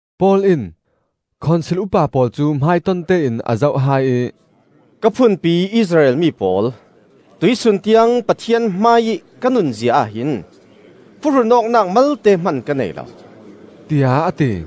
Paul in Khonsil upa pawl cu hmaiton tein a zoh hai ih, “Ka phunpi Israel mi pawl, tuihsun tiang Pathian hmaiih ka nunzia ahhin phuhrun awknak malte hman ka nei lo,” tiah a ti.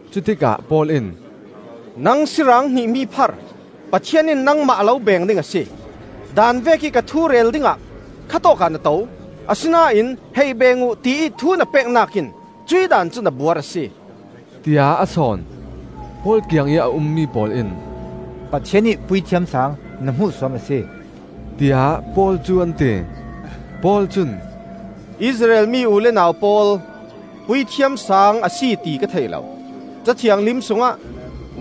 Cutikah Paul in, “Nang siirang hnihmi phar, Pathian in nangmah a lo beng ding a si. Daan vekih ka thu rel dingah kha tawkah na to; asinain ‘Hei beeng uh,’ tiih thu na peknak in cuih Daan cu na buar a si!” tiah a sawn. Paul kiangih a ummi pawl in, “Pathian ih Puithiam Saang na hmuhsuam a si!” tiah Paul cu an ti. Paul cun, “Israel mi u le nau pawl, Puithiam Saang a si ti ka thei lo! Ca Thianghlim sungah,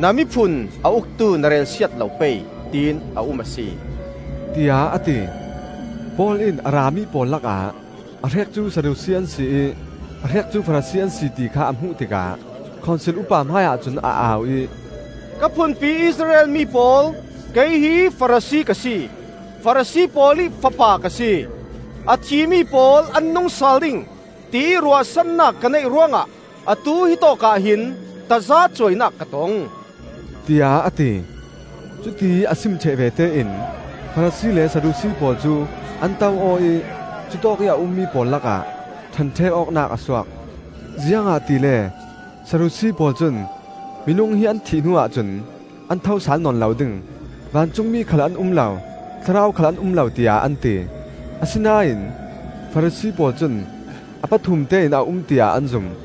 ‘Na miphun a uktu na relsiat lo pei,’ tiin a um a si,” tiah a ti. Paul in a rami pawl lakah a hrek cu Sadusi an si ih a hrek cu Farasi an si, ti kha a hmuh tikah Khonsil upa hmaiah cun a au ih, “Ka phunpi Israel mi pawl, kei hi Farasi ka si, Farasi pawl ih fapa ka si. A thimi pawl an nung sal ding, tiih ruahsannak ka neih ruangah atu hitawk ah hin tazacuainak ka tong,” tiah a ti. Cutiih a sim ṭheh vete in Farasi le Sadusi pawl cu an to aw ih cutawkih a ummi pawl lakah ṭhenṭhek awknak a suak. (Ziangahtile Sadusi pawl cun minung hi an thih hnuah cun an thosal nawn lo ding; vancungmi khal an um lo, thlarau khal an um lo, tiah an ti. Asinain Farasi pawl cun a pathum tein a um tiah an zum.)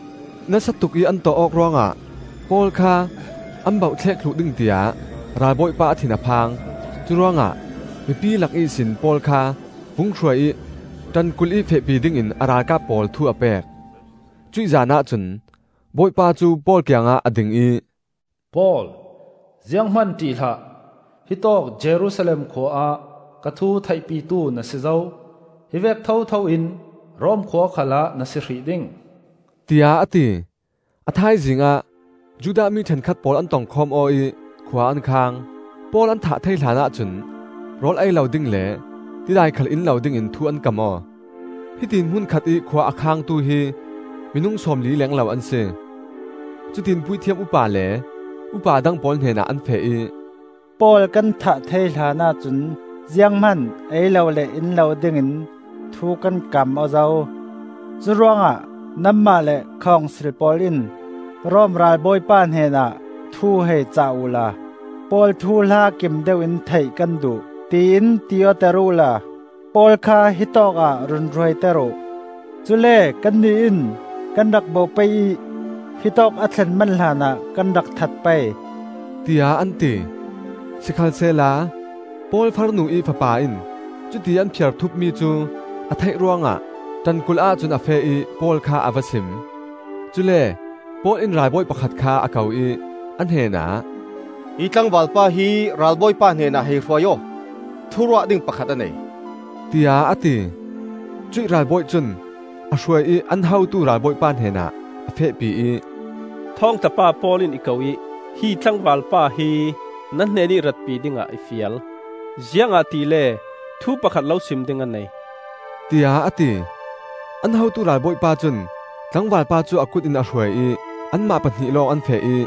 Nasa tukih an tawh awk ruangah Paul kha an bauhthlek thluh ding tiah ralbawipa a thin a phang. Curuangah mipi lak ihsin Paul kha vung hruai ih ṭankulh ih fehpi dingin a ralkap pawl thu a pek. Cuih zanah cun Bawipa cu Paul kiangah a ding ih, “Paul, zianghman ṭih hlah! Hitawk Jerusalem khua ah ka thu theihpitu na si zo, hivek thotho in Rom khua khalah na si hrih ding,” tiah a ti. A thaizing ah Judah mi ṭhenkhat pawl an tongkhawm aw ih khua an khang. Paul an thah thei hlanah cun rawl ei lo ding le tidai khal in lo dingin thu an kam aw. Hitiin hmun khatih khua a khangtu hi minung sawmli leng lo an si. Cutiin Puithiam upa le upa dang pawl hnenah an feh ih, “Paul kan thah thei hlanah cun zianghman ei lo le in lo dingin thu kan kam aw zo. Curuangah nanmah le Khonsil pawl in Rom ralbawipa hnenah thu hei cah uhla, Paul thuhla kim deuh in theih kan duh, tiin ti awter uhla, Paul kha hitawk ah run hruaiter uh. Cule kannih in kan rak bawh pei ih hitawk a thlen man hlanah kan rak that pei,” tiah an ti. Sikhalsehla Paul farnu-ih fapa in cutiih an phiarthupmi cu a theih ruangah ṭankulh-ah cun a feh ih Paul kha a va sim. Cule Paul in ralbawi pakhat kha a ko ih a hnenah, “Hi tlangvalpa hi ralbawipa hnenah hei hruai aw; thuruah ding pakhat a nei,” tiah a ti. Cuih ralbawi cun a hruai ih an hotu ralbawipa hnenah a fehpi ih, “Thawngtla pa Paul in i ko ih hi tlangvalpa hi na hnenih ratpi dingah i fial, ziangahtile thu pakhat lo sim ding a nei,” tiah a ti. An hotu ralbawipa cun tlangvalpa cu a kut in a hruai ih anmah pahnih lawng an feh ih,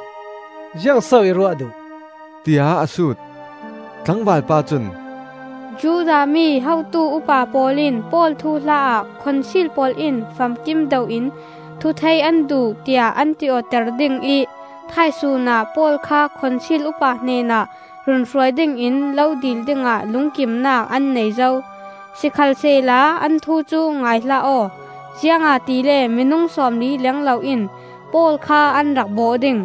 “Ziang so i ruah duh?” tiah a sut. Tlangvalpa cun, “Judah mi hotu upa pawl in Paul thuhla-ah Khonsil pawl in famkim deuh in thu theih an duh tiah an ti-awter ding ih thaisun ah Paul kha Khonsil upa hnenah run hruai dingin lo dil dingah lungkimnak an nei zo. Sikhalsehla an thu cu ngai hlah aw; ziangahtile minung sawmli leng lo in Paul kha an rak bawh ding.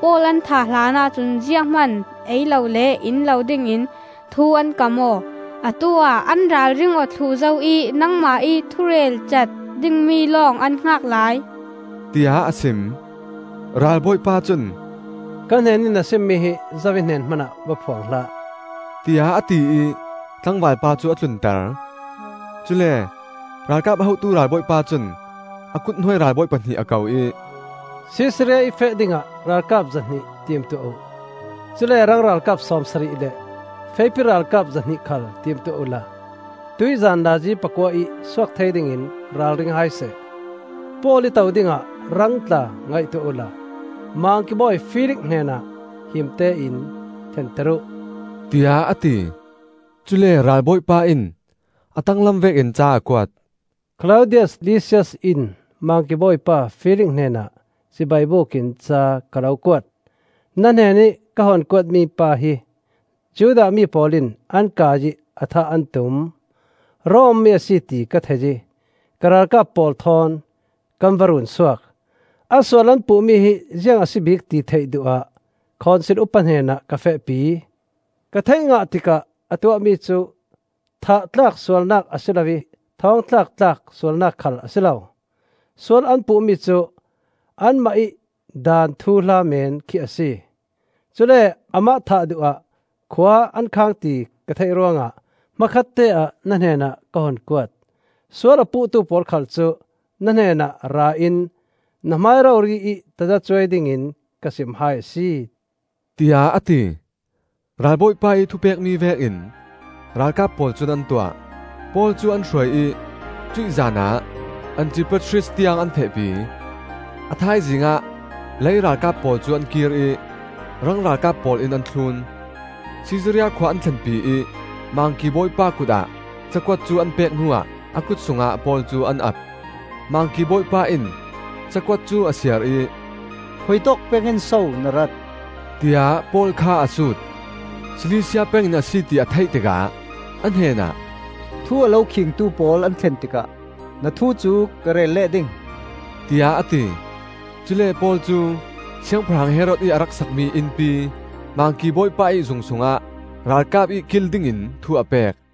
Paul an thah hlanah cun zianghman ei lo le in lo dingin thu an kam aw. Atu-ah an ralring aw thluh zo ih nangmah ih thurelcat dingmi lawng an hngak lai,” tiah a sim. Ralbawipa cun, “Ka hnenih na simmi hi zo ih hnen hmanah va phuang hlah,” tiah a ti ih tlangvalpa cu a tlunter. Cule ralkap hotu ralbawipa cun a kuthnuai ralbawi pahnih a ko ih, “Sisaria ih feh dingah ralkap zahnih timtuah uh. Cule rang ralkap sawmsarih le feipi ralkap zahnih khal timtuah uhla tuihzan nazi pakua ih suak thei dingin ralring hai seh. Paul ih to dingah rang tla ngaihtuah uhla Mangki bawi Felix hnenah himte in thlenter uh,” tiah a ti. Cule ralbawipa in a tanglam vekin ca a kuat. “Klaudius Lisias in Mangki Bawipa Felix hnenah cibai bukin ca ka lo kuat. Na hnenih ka hun kuat mipa hi Judah mi pawl in an kai ih a thah an tum. Rom mi a si ti ka thei ih ka ralkap pawl thawn kan va run suak. A sual an puhmi hi ziang a si bik ti theih duh ah Khonsil upa hnenah ka fehpi. Ka theih ngah tikah a tuahmi cu thah tlak sualnak a si lo ih thawng thlak tlak sualnak khal a si lo; sual an puhmi cu anmah ih daan thuhla men khi a si. Cule amah thah duh ah khua an khang ti ka theih ruangah hmakhatte ah na hnenah ka hun kuat. Sual a puhtu pawl khal cu na hnenah ra in na hmai rori ih tazacuai dingin ka sim hai a si,” tiah a ti. Ralbawipa ih thupekmi vekin ralkap pawl cun an tuah. Paul cu an hruai ih cuih zanah Antipatris tiang an fehpi. A thaizing ah lei ralkap pawl cu an kir ih rang ralkap pawl in an thlun. Sisaria khua an thlenpi ih Mangki Bawipa kutah cakuat cu an pek hnuah a kut sungah Paul cu an ap. Mangki Bawipa in cakuat cu a siar ih, “Khuitawk pengin so na rat?” tiah Paul kha a sut. Silisia pengin a si, ti a theih tikah a hnenah, “Thu a lo khingtu pawl an thlen tikah na thu cu ka rel leh ding,” tiah a ti. Cule Paul cu Siangpahrang Herod ih a rak sakmi innpi Mangki Bawipa ih zung sungah ralkap ih kil dingin thu a pek.